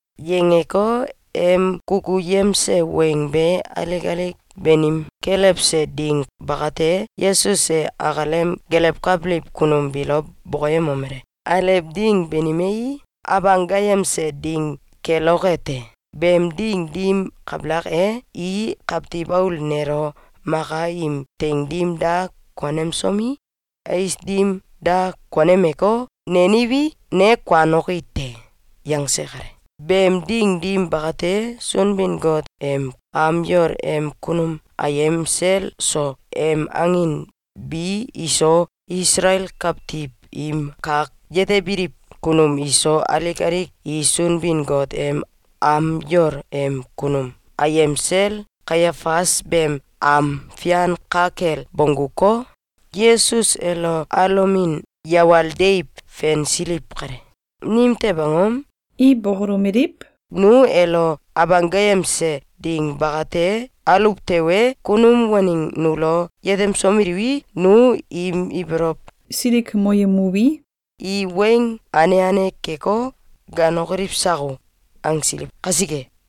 Yangeko, em kukuyemse weng be alik alik banim kelewse ding bakate, Yesus e akalem gelewkabiliw kunum biilo bokoyemomele: “Alew ding banimei, Abanggayemse Ding keloke te. Beem ding dim kabalak e, i Kawtiw Aul nelo maka im teing dim da konemsomi, ais dim da konemeko, neniwi, ne kuanoki te.”, yangse kale. Beem ding dim bakate, Sunbin-Got em am yol em kunum ayem sel so, em angin bi iso, Isalael kawtiw im kak yetebiliw kunum iso, alik alik i Sunbin-Got em am yol em kunum ayem sel Kaiafas beem am fian ka kel bongguko, Yesus elo alomin yawal deiw fensiliw kale. Nimtew angom? I bokolomeliw: “Nu elo Abanggayemse Ding bakate aluw tewe, kunum waneng nulo yetemsomeliwi, nu im ibolow silikmoyemuwi, i weng ane ane keko, ganokoliw sako!”, angsiliw kasike.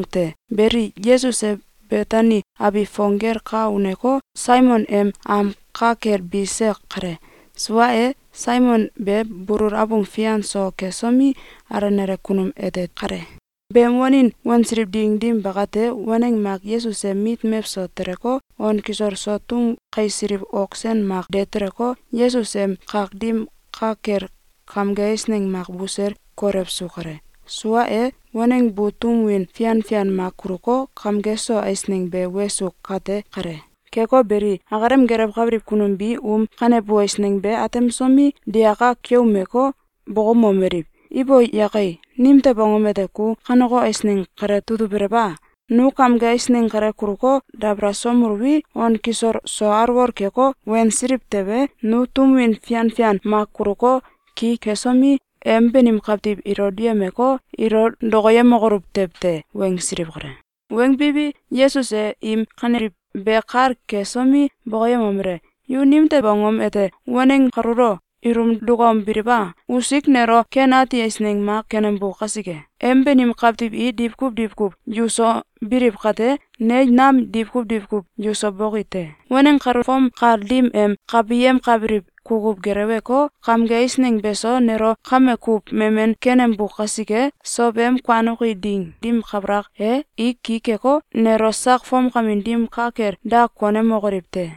Beli, Yesus e Betani abiw fong gel ka uneko, Saimon em am ka kel bise kale. Sua e, Saimon be bulul abung fian so kesomi, alenale kunum ete kale. Beem wanin wansiliw ding dim bakate, waneng mak Yesus em mit mewso teleko, on kisol so tum kaisiliw ok sen mak de teleko, Yesus em kak dim ka kel kamge eisneng mak busel kolewsu kale. Sua e, waneng bu tum win fian fian mak kuluko, kamge so eisneng be wesu kate kale. Keko beli, akalem gelewkabiliw kunum bi um kanebu eisneng be atemsomi, digaka keumeko, bokoumomeliw: “Ibo yake! Nimtew angom ete ku kaneko eisneng kale tutubelew a? Nu kamge eisneng kale kuluko, dabalasomeluwi, on kisol so alwol keko, wensiliw tewe, nu tum win fian fian mak kuluko, ki kesomi, em banim kawtiw ilo duyemeko, ilo dokoyemokoluw tew te!”, wangsiliw kale. Wangbiwi, Yesus e im kaneliw be kal kesomi, bokoyemomele: “Yu nimtew angom ete waneng kaluulo ilum dukaumbiliw a? Usik nelo ken ati eisneng mak kenembu kasike. Em banim kawtiw i diwkuw diwkuw yuso biliw kate, ne nam diwkuw diwkuw yuso boki te. Waneng kalu fom kal dim em kabiyemkabiliw kukuw geleweko, kamge eisneng beso nelo kame kuw memen kenembu kasike, sow em kuanoki ding dim kabalak e, i ki keko, nelo sak fomkamin dim ka kel da konemokoliw te.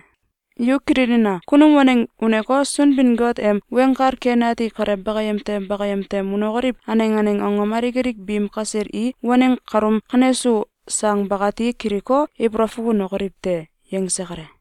Yu kililina! Kunum waneng uneko, Sunbin-Got em Weng Kal Ken Ati kale bakayem tem bakayem tem unokoliw aneng aneng angom alik alik biim kasel i waneng kaluum kanesu sang bakati kiliko, ibolow fukunokoliw te!”, yangse kale.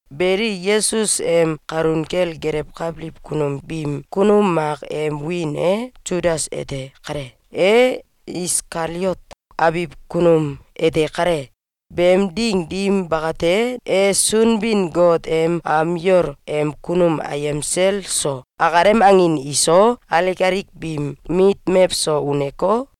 Beli, Yesus em kalun kel gelewkabiliw kunum biim kunum mak em wiin e Sudas ete kale. E Iskaliot abiw kunum ete kale. Beem ding dim bakate, e Sunbin-Got em am yol em kunum ayem sel so, akalem angin iso, alik alik biim mit mewso uneko,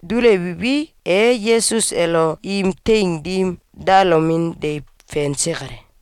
Dulewiwi, e Yesus elo im teing dim dalomin deiw fense kale.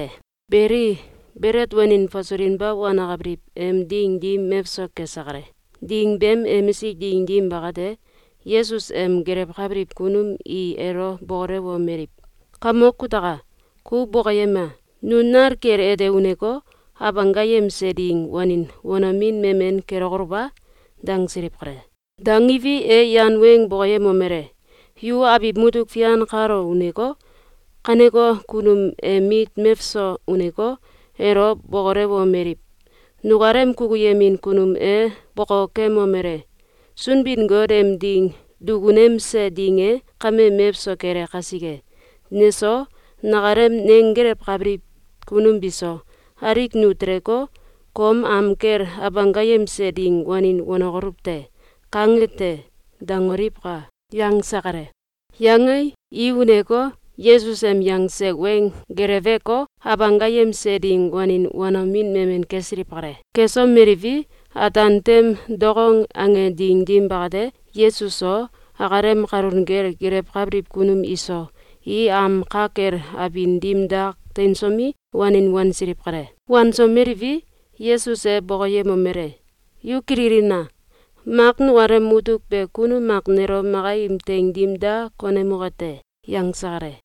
Beli, Belet Wanin Fasulinba Wanakabiliw em Ding dim mewso kese kale. Ding beem emisik ding dim bakate, Yesus em gelewkabiliw kunum i elo bokolewomeliw: “Kamok kutaka! Ku bokoyema! Nu nal kel ete uneko, Abanggayemse Ding wanin wanomin memen kelokoluw a?”, dangsiliw kale. Dangiwi, e yan weng bokoyemomele: “Yu abiw mutuk fian kalo uneko, kaneko kunum em mit mewso uneko, elo bokolewomeliw: ‘Nukalem kukuyemin kunum e bokokemomele: ‘Sunbin-Got em ding dukunemse ding e kame mewso kele kasike, neso, nakalem nenggelewkabiliw kunum biso, alik nu teleko, kom am kel Abanggayemse Ding wanin wanokoluw te.’, kange te.’, dangoliwka!’, yangse kale. Yangei, i uneko, Yesus em yangse weng geleweko, Abanggayemse Ding wanin wanomin memen kesiliw kale. Kesomeliwi, ataan tem dokong ange ding dim bakate, Yesus so, akalem kalun kel gelewkabiliw kunum iso, i am ka kel abin dim dak teinsomi, wanin wansiliw kale. Wansomeliwi, Yesus e bokoyemomele: “Yu kililina! Mak nukalem mutuk be kunum mak nelo maka im teing dim da konemoke te.”, yangse kale.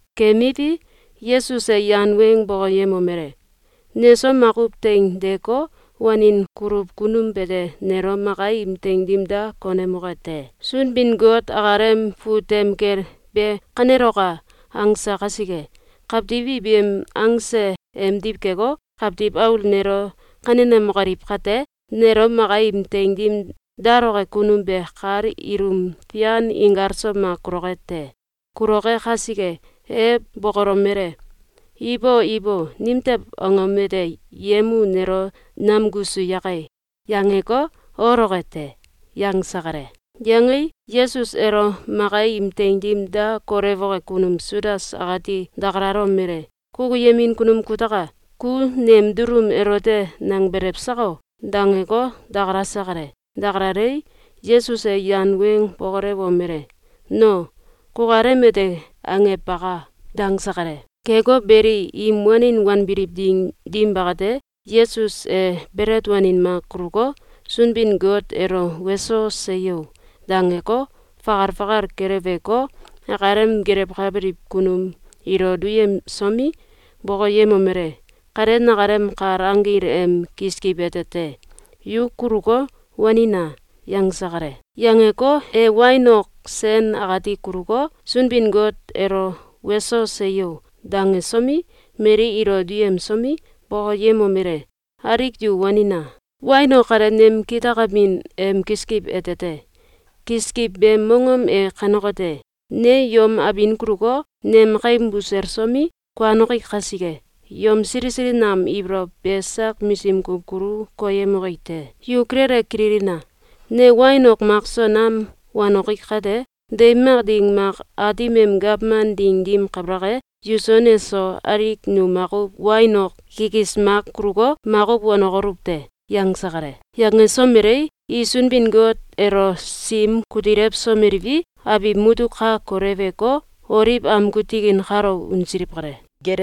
Kemiwi, Yesus e yan weng bokoyemomele: “Neso makuw teing deeko, wanin kuluw kunum bete nelo maka im teing dim da konemoke te. Sunbin-Got akalem fut tem kel ‘Be kaneloka!’, angse kasike, kawtiw i beem angse emdiw keko, Kawtiw Aul nelo kanenemokoliw kate, nelo maka im teing dim daloke kunum be kal ilum fian inkalso mak kuloke te. Kuloke kasike, e bokolomele: ‘Ibo ibo! Nimtew angom ete yem u nelo namkusu yake!’, yangeko, oloke te.”, yangse kale. Yangei, Yesus elo maka im teing dim da kolewoke kunum Sudas akati dakalalomele: “Kukuyemin kunum kutaka! Ku nem dulum elote nangbelew sako?”, dangeko, dakalase kale. Dakalalei, Yesus e yan weng bokolewomele: “No! Kukalem ete angew baka!”, dangse kale. Keko beli, im wanin wanbiliw ding dim bakate, Yesus e belet wanin mak kuluko, Sunbin-Got elo “Weso! Seyo!”, dangeko, fakal fakal keleweko, akalem gelewkabiliw kunum ilo duyemsomi, bokoyemomele: “Kale nakalem kal anggil em kiskiw ete te. Yu kuluko, wanina!”, yangse kale. Yangeko, e wain ok sen akati kuluko, Sunbin-Got elo “Weso! Seyo!”, dangesomi, mali ilo duyemsomi, bokoyemomele: “Alik yu wanina! Wain ok kale nem kitakamin em kiskiw ete te. Kiskiw beem mongom e kanekote: Ne yom abin kuluko, nem kaim buselsomi, kuanoki kasike, yom sili sili nam ibolow be sak misim kuw kulu koyemoki te. Yu kilele kililina! Ne wain ok makso nam wanoki kate, deiw mak ding mak, Aatim em gawman ding dim kabalak e, yuso neso alik nu makuw wain ok kikis mak kuluko, makuw wanokoluw te.”, yangse kale. Yangesomelei, i Sunbin-Got elo sim kutilewsomeliwi, abiw mutuk ka koleweko, Oliw amgu tikin kalo unsiliw kale.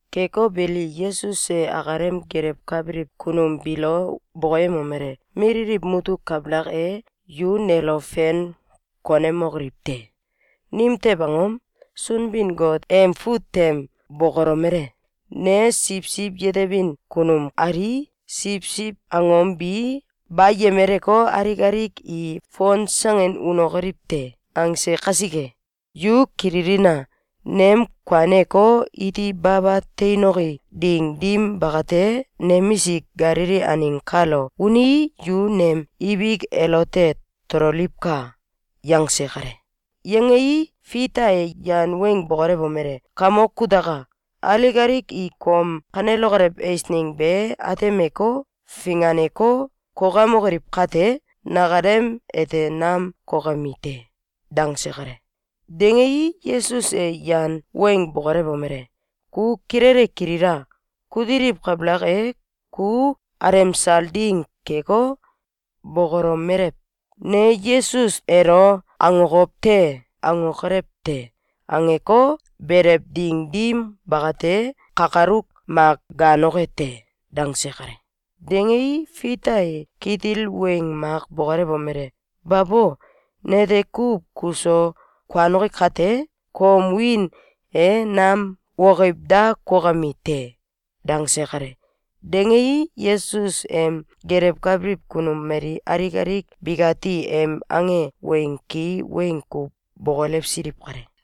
Keko beli, Yesus e akalem gelewkabiliw kunum biilo bokoyemomele: “Mililiw mutuk kabalak e, yu nelo fein konemokoliw te. Nimtew angom? Sunbin-Got em fut tem bokolomele: ‘Ne siwsiw yetebin kunum alii, siwsiw angom bi bayemeleko, alik alik i fonsangin unokoliw te.’, angse kasike. Yu kililina! Nem kuaneko, iti baba teinoki ding dim bakate, nemisik Galili aneng kalo unii, yu nem ibik elote tololiwka!”, yangse kale. Yangei, Fita e yan weng bokolewomele: “Kamok kutaka! Alik alik i kom kanelokolew eisneng be atemeko, finganeko, kokemokoliw kate, nakalem ete nam kokemi te!”, dangse kale. Dangei, Yesus e yan weng bokolewomele: “Ku kilele kilila! Kutiliw kabalak e, ku alemsal ding keko, bokolomelew: ‘Ne Yesus elo akokow te!’, angokolew te. Angeko, belew ding dim bakate, kakaluk mak gaanoke te.”, dangse kale. Dangei, Fita e kitil weng mak bokolewomele: “Babo! Nete kuw kuso kuanoki kate, kom wiin e nam wokiw da kokemi te.”, dangse kale. Dangei, Yesus em gelewkabiliw kunum mali alik alik bikati em ange weng ki weng kuw bokolewsiliw kale.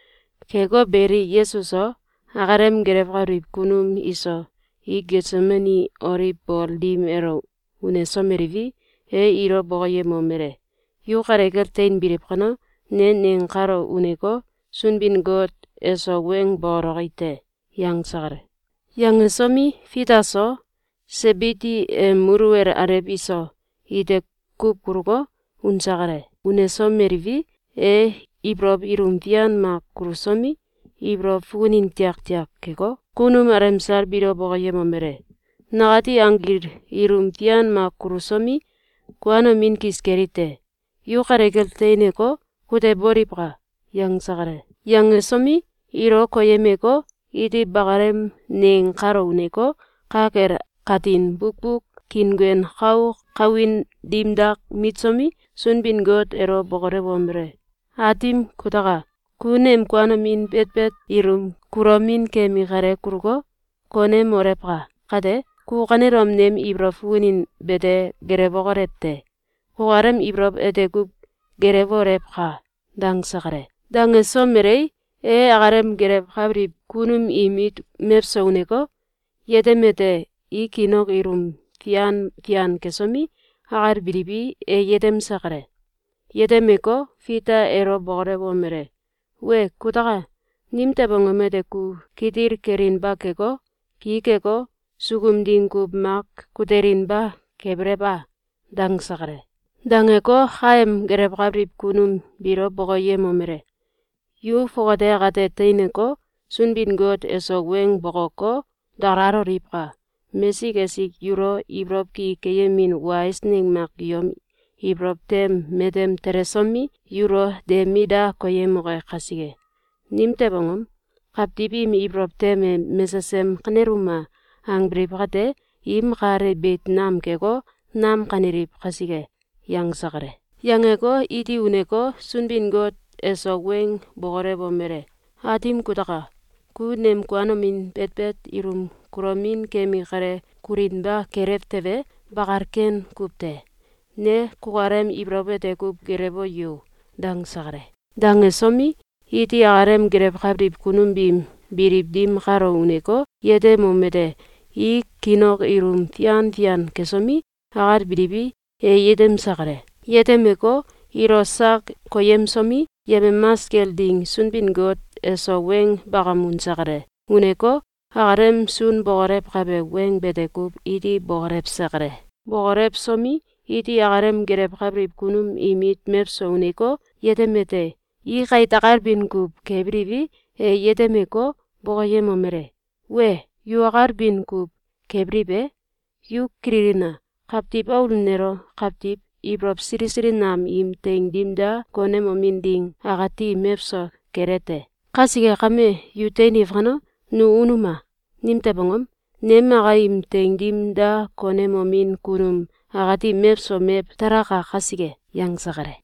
Keko beli, Yesus so, akalem gelewkabiliw kunum iso, i Getsemani Oliw bol dim elo unesomeliwi, e ilo bokoyemomele: “Yu kale kel teinbiliw kano, ne neng kalo uneko, Sunbin-Got eso weng bokoloki te.”, yangse kale. Yangesomi, Fita so, Sebidi em muluwel alew iso, ite kuw kuluko, unse kale. Unesomeliwi, e ibolow ilum fian mak kulusomi, ibolow fukunin tiaktiak keko, kunum alemsal biilo bokoyemomele: “Nakati anggil ilum fian mak kulusomi, kuanomin kis keli te. Yu kale kel teineko, kuteboliwka!”, yangse kale. Yangesomi, ilo koyemeko, iti bakalem neng kalo uneko, ka kel katin bukbuk kiinguen kau kawin dim dak mitsomi, Sunbin-Got elo bokolewomele: “Aatim kutaka! Ku nem kuanomin betbet ilum kulomin kemi kale kuluko, konemolewka! Kate, ku kanelom nem ibolow fukunin bete gelewokolew te! Kukalem ibolow ete kuw gelewolewka!”, dangse kale. Dangesomelei, e akalem gelewkabiliw kunum im mit mewso uneko, yetemete: I kiin ok ilum fian fian kesomi, akalbiliwi, e yetemse kale. Yetemeko, Fita elo bokolewomele: “Wee kutaka! Nimtew angom ete ku kitil kelinba keko, ki keko, sukum ding kuw mak kutelinba kebelew a?”, dangse kale. Dangeko, kaem gelewkabiliw kunum biilo bokoyemomele: “Yu fongate akate teineko, Sunbin-Got eso weng bokoko, dakalaloliwka! Mesik esik yulo ibolow ki keyemin wa eisneng mak yom ibolow tem matem telesomi, yulo de mit da koyemoke kasike! Nimtew angom? Kawtiw im ibolow tem e ‘Mesesem kaneluma!’, angbiliw kate, im kal e beit nam keko, nam kaneliw kasike.”, yangse kale. Yangeko, iti uneko, Sunbin-Got eso weng bokolewomele: “Aatim kutaka! Ku nem kuanomin betbet ilum kulomin kemi kale kulinba kelew tewe, bakal ken kuw te. Ne kukalem ibolow ete kuw gelewo yo!”, dangse kale. Dangesomi, iti akalem gelewkabiliw kunum biim biliw dim kalo uneko, yetemomete: I kiin ok ilum fian fian kesomi, akalbiliwi, e yetemse kale. Yetemeko, ilo sak koyemsomi, yemamas kel ding Sunbin-Got eso weng bakam unse kale. Uneko, akalem sun bokolewkabe weng bete kuw iti bokolewse kale. Bokolewsomi, iti akalem gelewkabiliw kunum im mit mewso uneko, yetemete: I kait akalbin kuw kebiliwi, e yetemeko, bokoyemomele: “Wee! Yu akalbin kuw kebiliw e? Yu kililina! Kawtiw Aul nelo kawtiw ibolow sili sili nam im teing dim da konemomin ding akati mewso kele te. Kasike kame, yu teiniw kano, nu unuma! Nimtew angom? Nem maka im teing dim da konemomin kunum akati mewso mew talaka kasike.”, yangse kale.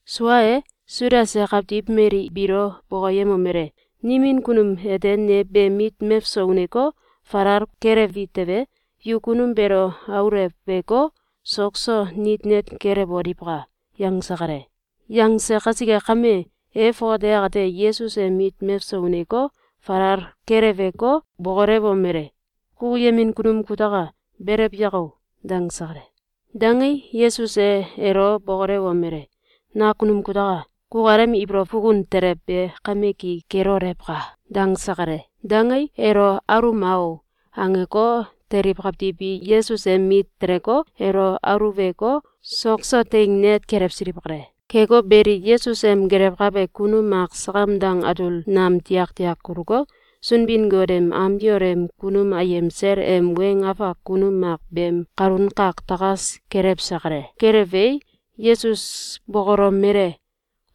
Sua e, Sudas e kawtiw mali biilo bokoyemomele: “Nimin kunum ete ne beem mit meso uneko, falal kelewi tewe, yu kunum beelo auleweko, sok so nit net kelewoliwka!”, yangse kale. Yangse kasike kame, e fongate akate Yesus em mit mewso uneko, falal keleweko, bokolewomele: “Kukuyemin kunum kutaka! Belew yako!”, dangse kale. Dangei, Yesus e elo bokolewomele: “Nakunum kutaka! Kukalem ibolow fukun telew be kame ki kelolewka!”, dangse kale. Dangei, “Elo aluma o!”, angeko, teliw kawtiw bi Yesus em mit teleko, elo aluweko, sok so teing net kelewsiliw kale. Keko beli, Yesus em gelewkabe kunum mak sakam dang atul nam tiaktiak kuluko, Sunbin-Got em am yol em kunum ayem sel em weng afak kunum mak beem kalun kak takas kelewse kale. Kelewei, Yesus bokolomele: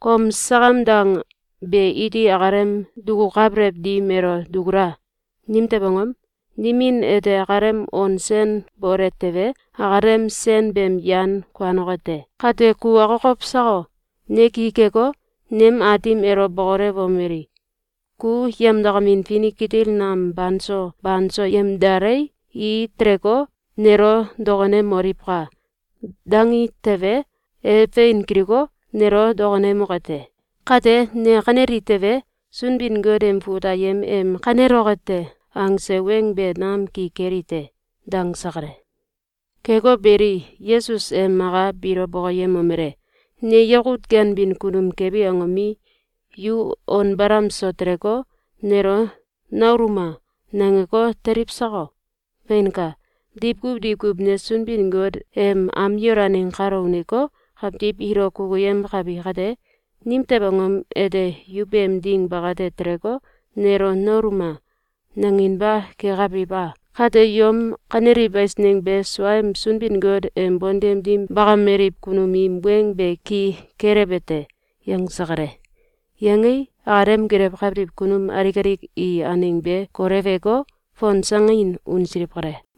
“Kom sakam dang be iti akalem dukukabelew dim elo dukula! Nimtew angom? Nimin ete akalem on sen bole tewe, akalem sen beem yan kuanoke te. Kate ku akokow sako? Ne ki keko, nem Aatim elo bokolewomeli: ‘Ku yemdakamin finik kitil nam banso banso yemdalei, i teleko, nelo dokonemoliwka!’, dangi tewe, e fein kiliko, nelo dokonemoke te. Kate, ne kaneli tewe, Sunbin-Got em fut ayem em ‘Kaneloke te!’, angse weng be nam ki keli te.”, dangse kale. Keko beli, Yesus e maka biilo bokoyemomele: “Ne yakut ganbin kunum kebi angomi, yu on balam so teleko, nelo ‘Naluuma!’, nangeko, teliw sako? Feinka! Diwkuw diwkuw ne Sunbin-Got em am yol aneng kalo uneko, kawtiw ilo kukuyemkabi kate, nimtew angom ete yu beem ding bakate teleko, nelo ‘Naluuma!’, nanginba kekabiliw a? Kate yom kaneliw eisneng be suaem Sunbin-Got em bontem dim bakameliw kunum im weng be ki kelewbe te.”, yangse kale. Yangei, akalem gelewkabiliw kunum alik alik i aneng be koleweko, fonsangin unsiliw kale.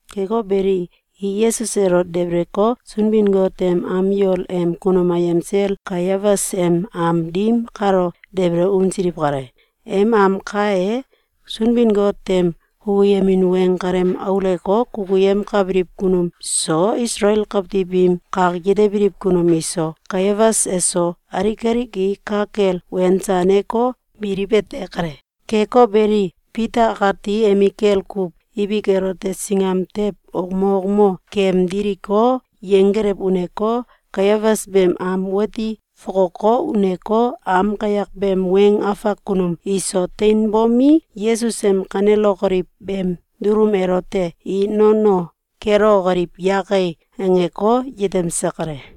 Keko beli, i Yesus elo debeleko, Sunbin-Got em am yol em kunum ayem sel Kaiafas em am dim kalo debele unsiliw kale. Em am kae, Sunbin-Got em kukuyemin weng kalem aulewko, kukuyemkabiliw kunum so, Isalael kawtiw im kak yetebiliw kunum iso, Kaiafas eso, alik alik i ka kel wensaneko, biliw ete kale. Keko beli, Fita akati emikel kuw ibik elote singam tew wokmo wokmo kemdiliko, yenggelew uneko, Kaiafas beem am wati fokoko, uneko, am kayak beem weng afak kunum iso teinbomi, Yesus em kanelokoliw beem dulum elote “I nono kelewokoliw yake!”, angeko, yetemse kale.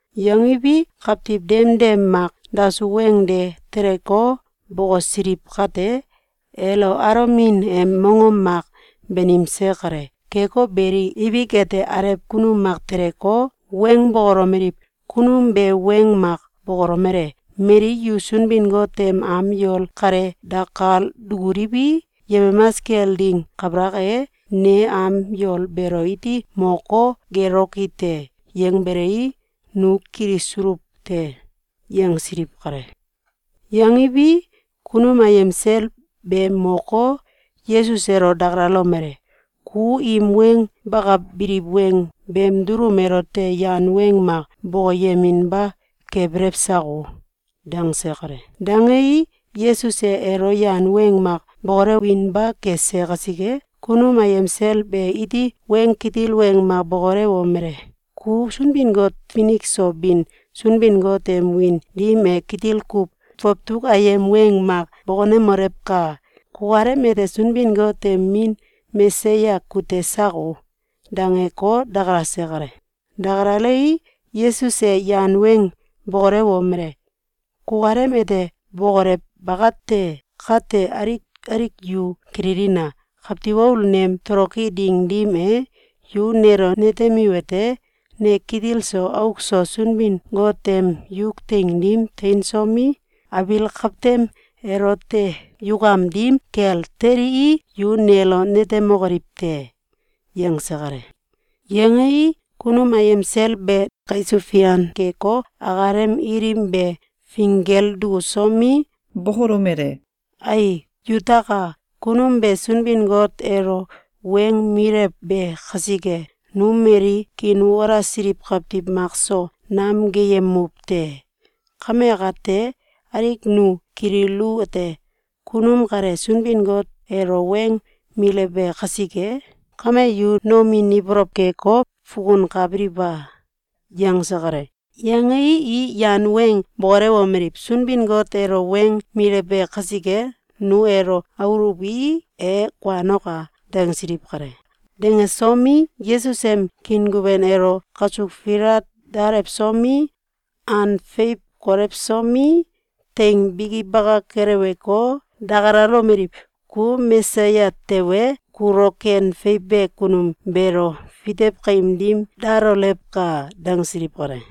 Yangiwi, kawtiw demdem mak dasuw weng de teleko, bokosiliw kate, elo alomin em mongom mak banimse kale. Keko beli, ibik ete, alew kunum mak teleko, weng bokolomeliw: “Kunum be weng mak bokolomele: ‘Mali yu Sunbin-Got em am yol kale dakal dukuliwi, yemamas kel ding kabalak e, ne am yol beelo iti moko, geloki te.’, yangbelei, nu kilisuluw te!”, yangsiliw kale. Yangiwi, kunum ayem sel be moko, Yesus elo dakalalomele: “Ku im weng bakabiliw weng beem dulum elote yan weng mak bokoyeminba kebelew sako?”, dangse kale. Dangei, Yesus e elo yan weng mak bokolewinba kese kasike, kunum ayem sel be iti weng kitil weng mak bokolewomele: “Ku Sunbin-Got finik so bin Sunbin-Got em wiin dim e kitil kuw fawtuk ayem weng mak bokonemolewka! Kukalem ete Sunbin-Got em Min Mesaya kute sako?”, dangeko, dakalase kale. Dakalalei, Yesus e yan weng bokolewomele: “Kukalem ete bokolew bakate! Kate alik alik yu kililina! Kawtiw Aul nem toloki ding dim e, yu nelo netemiwete: Ne kitil so auk so Sunbin-Got em yuk teing dim teinsomi, abiil kawtem elote yukam dim kel telii, yu nelo netemokoliw te.”, yangse kale. Yangei, kunum ayem sel be kaisuw fian keko, akalem ilim be finggel dukusomi, bokolomele: “Ai yutaka! Kunum be Sunbin-Got elo weng milewbe kasike, nu mali kiinwalasiliw kawtiw makso nam gaayemuw te. Kame akate, alik nu kililuwete: Kunum kale Sunbin-Got elo weng milewbe kasike! Kame yu nomin ibolow keko, fukunkabiliw a?”, yangse kale. Yangei, i yan weng bokolewomeliw: “Sunbin-Got elo weng milewbe kasike, nu elo aluwi, e kuanoka!”, dangsiliw kale. Dangesomi, Yesus em kiinguen elo kasuk filat dalewsomi, an feiw kolewsomi, teing biki baka keleweko, dakalalomeliw: “Ku Mesaya tewe, kulo ken feiwbe kunum beelo fitew kaim dim dalolewka!”, dangsiliw kale.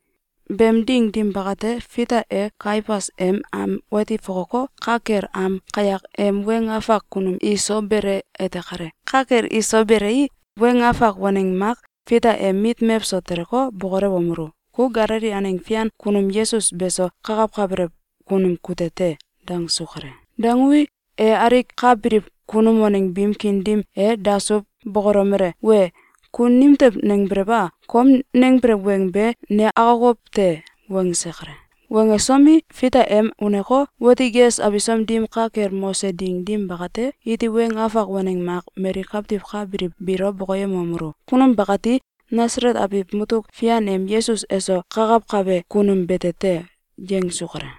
Beem ding dim bakate, Fita e Kaiafas em am wati fokoko, ka kel am kayak em weng afak kunum iso bele ete kale. Ka kel iso belei, weng afak waneng mak Fita em mit mewso teleko, bokolewomelu: “Ku Galili aneng fian kunum Yesus beso kakawkabelew kunum kute te!”, dangsu kale. Dangui, e alik ka biliw kunum waneng biim kiin dim e dasuw bokolomele: “Wee! Ku nimtew nangbelew a? Kom nangbelew weng be ne akokow te!”, wangse kale. Wangesomi, Fita em uneko, wati ges abisom dim ka kel mose ding dim bakate, iti weng afak waneng mak mali kawtiw ka biliw biilo bokoyemomelu: “Kunum bakati Nasalet abiw mutuk fian em Yesus eso kakawkabe kunum bete te.”, yangsu kale.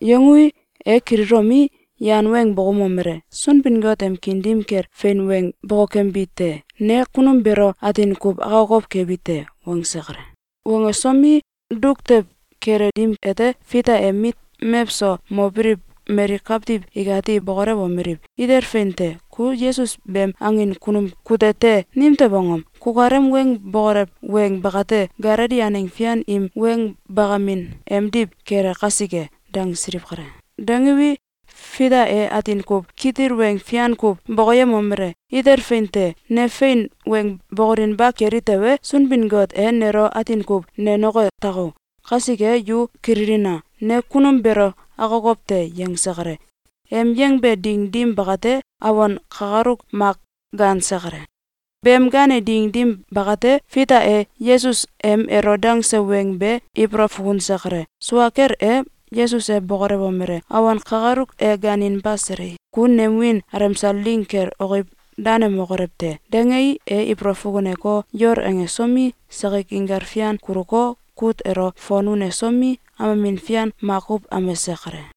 Yangui, e kililomi, yan weng bokoumomele: “Sunbin-Got em kiin dim kel fein weng bokokembi te! Ne kunum beelo atin kuw akokow kebi te!”, wangse kale. Wangesomi, duk tew kele dim ete, Fita em mit mewso mobiliw mali kawtiw ikati bokolewomeliw: “Itel fein te! Ku Yesus beem angin kunum kute te! Nimtew angom? Kukalem weng bokolew weng bakate Galili aneng fian im weng bakamin emdiw kele kasike!”, dangsiliw kale. Dangiwi, Fita e atin kuw kitil weng fian kuw bokoyemomele: “Itel fein te! Ne fein weng bokolinba keli tewe, Sunbin-Got e nelo atin kuw nenoke tako! Kasike yu kililina! Ne kunum beelo akokow te!”, yangse kale. Em yangbe ding dim bakate, awon kakaluk mak gaanse kale. Beem gaane ding dim bakate, Fita e Yesus em elo dangse weng be ibolow fukunse kale. Sua kel e, Yesus e bokolewomele: “Awon kakaluk e gaaninba selei, ku nem wiin alemsal ding kel wokiw danemokolew te!”, dangei, e ibolow fukuneko, yol angesomi, sakik inkal fian kuluko, kut elo fon unesomi, amemin fian makuw amese kale.